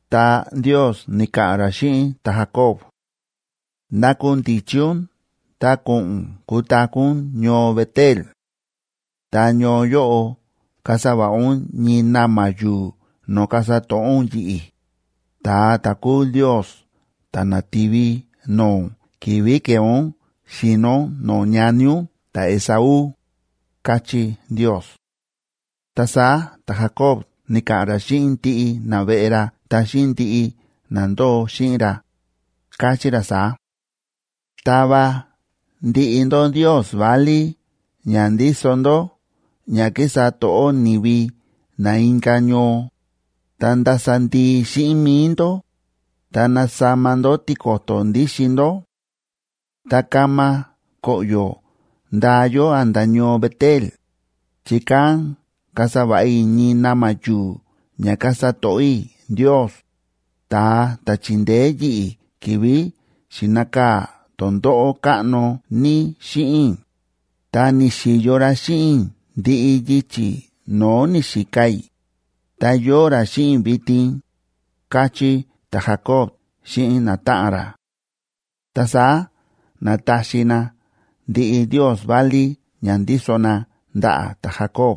Ta Ndios ni̱ka̱ꞌa̱n ra xíꞌin ta̱Jacob: ―Nakundichi ún ta ko̱ꞌo̱n ún kutaku̱ ún ñoo Bet‑el. Ta ñoo yóꞌo kasa va̱ꞌa ún ñii na̱ma̱ yu̱u̱ no̱o̱ kasa to̱ꞌó ún yi̱ꞌi̱, ta̱a ta̱ kúu Ndios ta̱ na̱ti̱vi no̱o̱ ún ki̱vi̱ ke̱e ún xi̱no ún no̱o̱ ñani ún ta̱Esaú ―káchí Ndios. Ta saá ta̱Jacob ni̱ka̱ꞌa̱n ra xíꞌin ndiꞌi naveꞌe ra ta xíꞌin ndiꞌi na ndóo xíꞌin ra, káchí ra saá: ―Tava ndiꞌi ndó ndios válí ña ndíso ndó ña kísa to̱ꞌó ni̱vi na inka̱ ñoo, ta ndasa ndii xíꞌin mi̱i ndó, ta nasama ndó tiko̱to̱ ndíxin ndó. Ta kama koꞌyo̱ ndaa yó a̱nda̱ ñoo Bet‑el, chi kán kasa va̱ꞌa i̱ ñii na̱ma̱ yu̱u̱ ña kasa to̱ꞌó i̱ Ndios, ta̱a ta̱ chi̱ndeé yi̱ꞌi̱ ki̱vi̱ xi̱nakaa̱ tondóꞌó káꞌno ní xíꞌin i̱, ta ni̱xi̱yo ra xíꞌin i̱ ndiꞌi yichi̱ no̱o̱ ni̱xika i̱, ta yóo ra xíꞌin i̱ vitin ―káchí ta̱Jacob xíꞌin natáꞌan ra. Ta saá na̱taxi na ndiꞌi ndios válí ña ndíso na ndaꞌa̱ ta̱Jacob,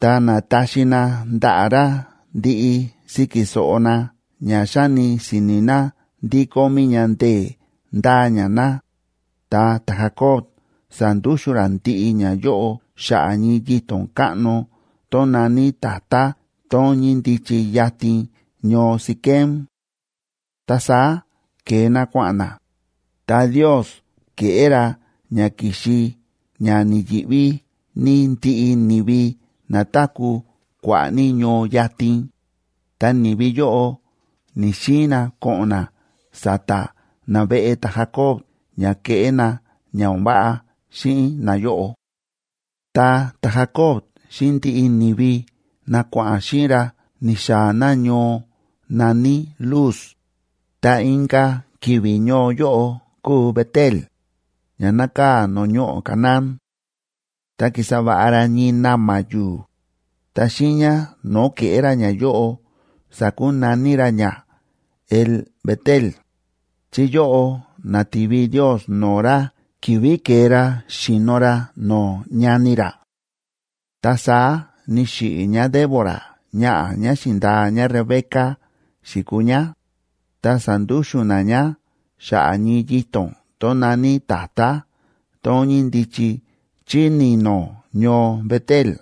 ta na̱taxi na ndaꞌa̱ ra ndiꞌi síki so̱ꞌo na ña xáni si̱ni̱ na ndí kómí ña ndee̱ ndáa ña na, ta ta̱Jacob sa̱ndúxu̱n ra ndiꞌi ñayóꞌo xa̱ꞌa̱ ñii yito̱n káꞌno tón na̱ní tatá tón ñíndichi yatin ñoo Siquem. Ta saá ke̱e na kua̱ꞌa̱n na, ta Ndios ke̱ꞌé ra ña ki̱xi ña ni̱yi̱ꞌví ní ndiꞌi ni̱vi na táku̱ kua̱ꞌa̱ ní ñoo yatin, ta ni̱vi yóꞌo ni̱‑xiin na ko̱ꞌo̱n na sa̱ta̱ naveꞌe ta̱Jacob ña keꞌé na ña o̱n váꞌa xíꞌin nayóꞌo. Ta ta̱Jacob xíꞌin ndiꞌi ni̱vi na kua̱ꞌa̱n xíꞌin ra ni̱xaa̱ na ñoo na̱ní Luz, ta inka̱ ki̱vi̱ ñoo yóꞌo kúu Bet‑el, ña nákaa̱ no̱o̱ ñoꞌo̱ Canaán. Ta ki̱sa va̱ꞌa ra ñii na̱ma̱ yu̱u̱, ta xiiña no̱o̱ ke̱ꞌé ra ñayóꞌo sa̱kunaní ra ña El‑bet‑el, chi yóꞌo na̱ti̱vi Ndios no̱o̱ ra ki̱vi̱ ke̱e ra xi̱no ra no̱o̱ ñani ra. Ta saá ni̱xiꞌi̱ ñáDébora ñaꞌa̱ ñá xi̱ndaa ñáRebeca xi̱kuu ñá, ta sa̱ndúxu̱n na ñá xa̱ꞌa̱ ñii yito̱n tón na̱ní tatá tón ñíndichi chí ni̱no̱ ñoo Bet‑el.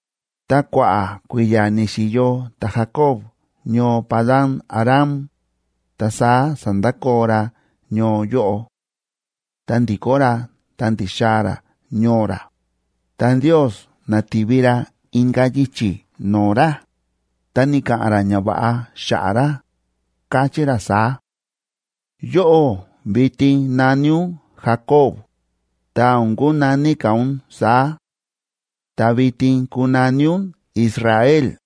Ta kua̱ꞌa̱ kui̱ya̱ ni̱xi̱yo ta̱Jacob ñoo Padan‑aram, ta saá sa̱ndakoo ra ñoo yóꞌo. Ta ndi̱kó ra ta ndi̱xaa̱ ra ñoo ra, ta Ndios na̱ti̱vi ra inka̱ yichi̱ no̱o̱ ra, ta ni̱ka̱ꞌa̱n ra ñava̱ꞌa xa̱ꞌa̱ ra, káchí ra saá: Yóꞌó vitin na̱ní ún Jacob,b ta o̱n kunaní ka̱ ún saá; ta vitin kunaní ún Israel,c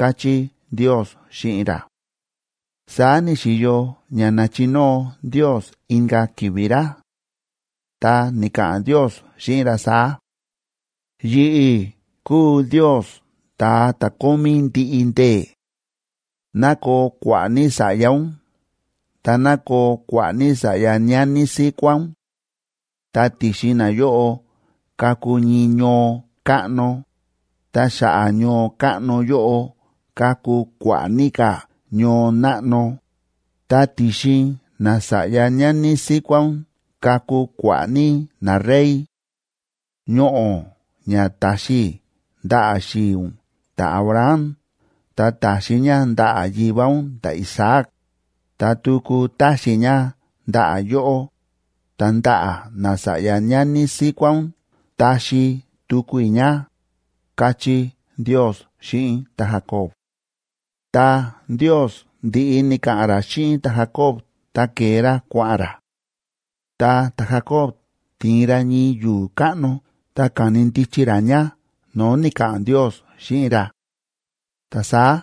káchí Ndios xíꞌin ra. Saá ni̱xi̱yo ña na̱chinóo Ndios inka̱ ki̱vi̱ ra. Ta ni̱ka̱ꞌa̱n Ndios xíꞌin ra saá: Yi̱ꞌi̱ kúu Ndios Ta̱a ta̱ Kómí Ndiꞌi Ndee̱; ná koo kua̱ꞌa̱ ní sa̱ꞌya ún ta ná koo kua̱ꞌa̱ ní sa̱ꞌya ñani síkuá ún. Ta ti̱xin nayóꞌo kaku ñii ñoo káꞌno, ta xa̱ꞌa̱ ñoo káꞌno yóꞌo kaku kua̱ꞌa̱ ní ka̱ ñoo náꞌno, ta ti̱xin nasa̱ꞌya ñani síkuá ún kaku kua̱ꞌa̱ ní narey. Ñoꞌo̱ ña ta̱xi i̱ ndaꞌa̱ xi̱i̱ ún ta̱Abraham ta ta̱xi i̱ ña ndaꞌa̱ yivá ún ta̱Isaac, ta tuku taxi i̱ ña ndaꞌa̱ yóꞌó, ta ndaꞌa̱ nasa̱ꞌya ñani síkuá ún taxi tuku i̱ ña, káchí Ndios xíꞌin ta̱Jacob. Tá Ndios ndi̱ꞌi ni̱ka̱ꞌa̱n ra xíꞌin ta̱Jacob ta ke̱e ra kua̱ꞌa̱n ra. Ta ta̱Jacob ti̱in ra ñii yu̱u̱ káꞌno ta ka̱ni ndichi ra ña no̱o̱ ni̱ka̱ꞌa̱n Ndios xíꞌin ra; ta saá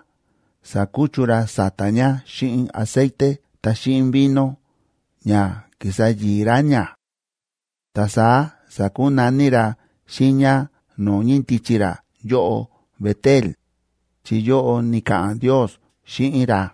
sa̱kuchu ra sa̱ta̱ ña xíꞌin aceite ta xíꞌin vino ña ki̱sa yi̱i̱ ra ña. Ta saá sa̱kunaní ra xiiña no̱o̱ ñíndichi ra yóꞌo Bet‑el,d chi yóꞌo ni̱ka̱ꞌa̱n Ndios xíꞌin ra.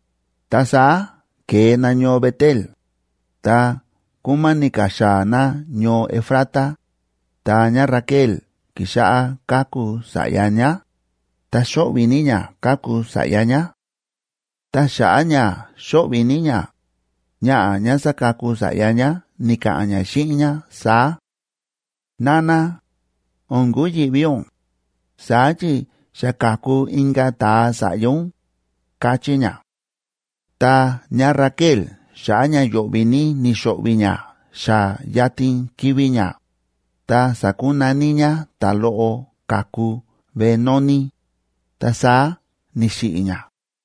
Ta saá ke̱e na ñoo Bet‑el, ta kúmáni̱ ka̱ xaa̱ na ñoo Efrata, ta ñáRaquel ki̱xáꞌá káku sa̱ꞌya ñá, ta xóꞌvi̱ ní ñá káku sa̱ꞌya ñá. Ta xa̱ꞌa̱ ña xóꞌvi̱ ní ñá, ñaꞌa̱ ñá sákaku sa̱ꞌya ñá ni̱ka̱ꞌa̱n ñá xíꞌin ñá saá: ―Nana, o̱n kuyi̱ꞌví ún, saá chi xa ka̱ku inka̱ ta̱a sa̱ꞌya ún ―káchí ñá. Ta ñáRaquel xa̱ꞌa̱ ña yo̱ꞌvi̱ ní ni̱xo̱ꞌvi̱ ñá xa yatin kivi̱ ñá, ta sa̱kunaní ñá ta̱loꞌo ka̱ku Benoni,e ta saá ni̱xiꞌi̱ ñá;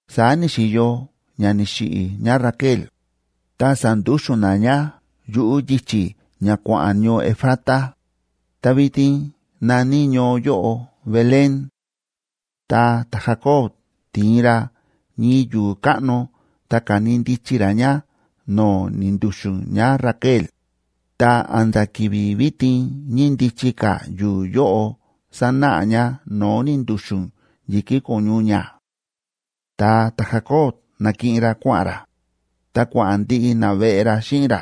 Saá ni̱xi̱yo ña ni̱xiꞌi̱ ñáRaquel, ta sa̱ndúxu̱n na ñá yuꞌu̱ yichi̱ ña kua̱ꞌa̱n ñoo Efrata, ta vitin na̱ní ñoo yóꞌo Belén. Ta ta̱Jacob ti̱in ra ñii yu̱u̱ káꞌno ta ka̱ni ndichi ra ña no̱o̱ ni̱ndu̱xu̱n ñáRaquel, ta a̱nda̱ ki̱vi̱ vitin ñíndichi ka̱ yu̱u̱ yóꞌo sánáꞌa ña no̱o̱ ni̱ndu̱xu̱n yi̱kí ko̱ñu ñá. Ta ta̱Jacobg na̱kiꞌin ra kua̱ꞌa̱n ra, ta kua̱ꞌa̱n ndiꞌi naveꞌe ra xíꞌin ra,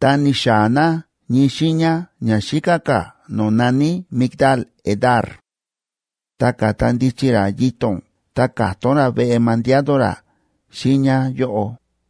ta ni̱xaa̱ na ñii xiiña ña xíká ka̱ no̱o̱ na̱ní Migdal‑edar. Ta ka̱ta ndichi ra yito̱n ta ka̱tón ra veꞌe mandiado ra xiiña yóꞌo.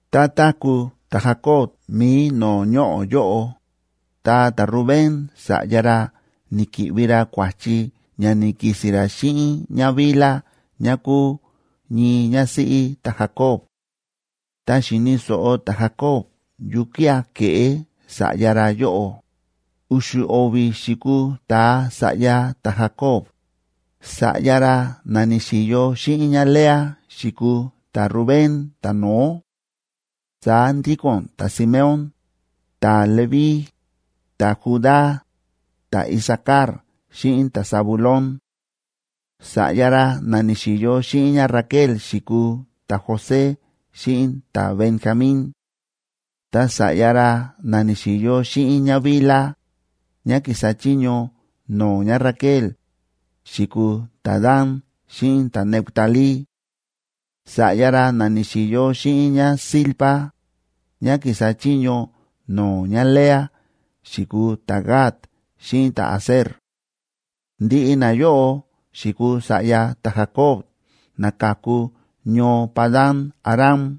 Tá táku̱ ta̱Jacob mi̱i no̱o̱ ñoꞌo̱ yóꞌo, ta ta̱Rubén sa̱ꞌya ra ni̱ki̱ꞌvi ra kua̱chi ña ni̱ki̱si̱n ra xíꞌin ñáBilha ñá kúu ñii ñásíꞌí ta̱Jacob. Ta xi̱ni̱ so̱ꞌo ta̱Jacob yukía̱ ke̱ꞌé sa̱ꞌya ra yóꞌo. U̱xu̱ o̱vi̱ xi̱kuu ta̱a sa̱ꞌya ta̱Jacob. Sa̱ꞌya ra na ni̱xi̱yo xíꞌin ñáLea xi̱kuu ta̱Rubén ta̱no̱ó; saá ndíko̱n ta̱Simeón, ta̱Leví, ta̱Judá, ta̱Isacar xíꞌin ta̱Zabulón. Sa̱ꞌya ra na ni̱xi̱yo xíꞌin ñáRaquel xi̱kuu ta̱José xíꞌin ta̱Benjamín. Ta sa̱ꞌya ra na ni̱xi̱yo xíꞌin ñáBilha, ñá kísa chiño no̱o̱ ñáRaquel, xi̱kuu ta̱Dan xíꞌin ta̱Neftalí. Sa̱ꞌya ra na ni̱xi̱yo xíꞌin ñáZilpa, ñá kísa chiño no̱o̱ ñáLea, xi̱kuu ta̱Gad xíꞌin ta̱Aser. Ndiꞌi nayóꞌo xi̱kuu sa̱ꞌya ta̱Jacob na ka̱ku ñoo Padan‑aram.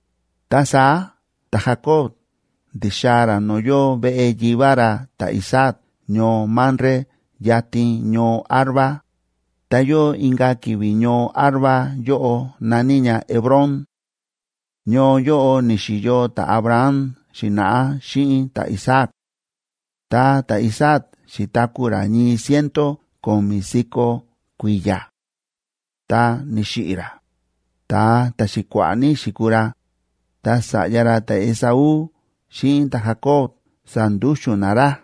Ta saá ta̱Jacob ndi̱xaa̱ ra no̱o̱ yóo veꞌe yivá ra ta̱Isaac ñoo Mamre yatin ñoo Arba, ta yóo inka̱ ki̱vi̱ ñoo Arba yóꞌo na̱ní ña Hebrón. Ñoo yóꞌo ni̱xi̱yo ta̱Abraham xi̱na̱ꞌá xíꞌin ta̱Isaac. Ta ta̱Isaac xi̱taku̱ ra ñii ciento ko̱mi̱ si̱ko̱ kui̱ya̱. Ta ni̱xiꞌi̱ ra, ta̱a ta̱xi̱kua̱ꞌa̱ ní xi̱kuu ra, ta sa̱ꞌya ra ta̱Esaú xíꞌin ta̱Jacob sa̱ndúxu̱n na ra.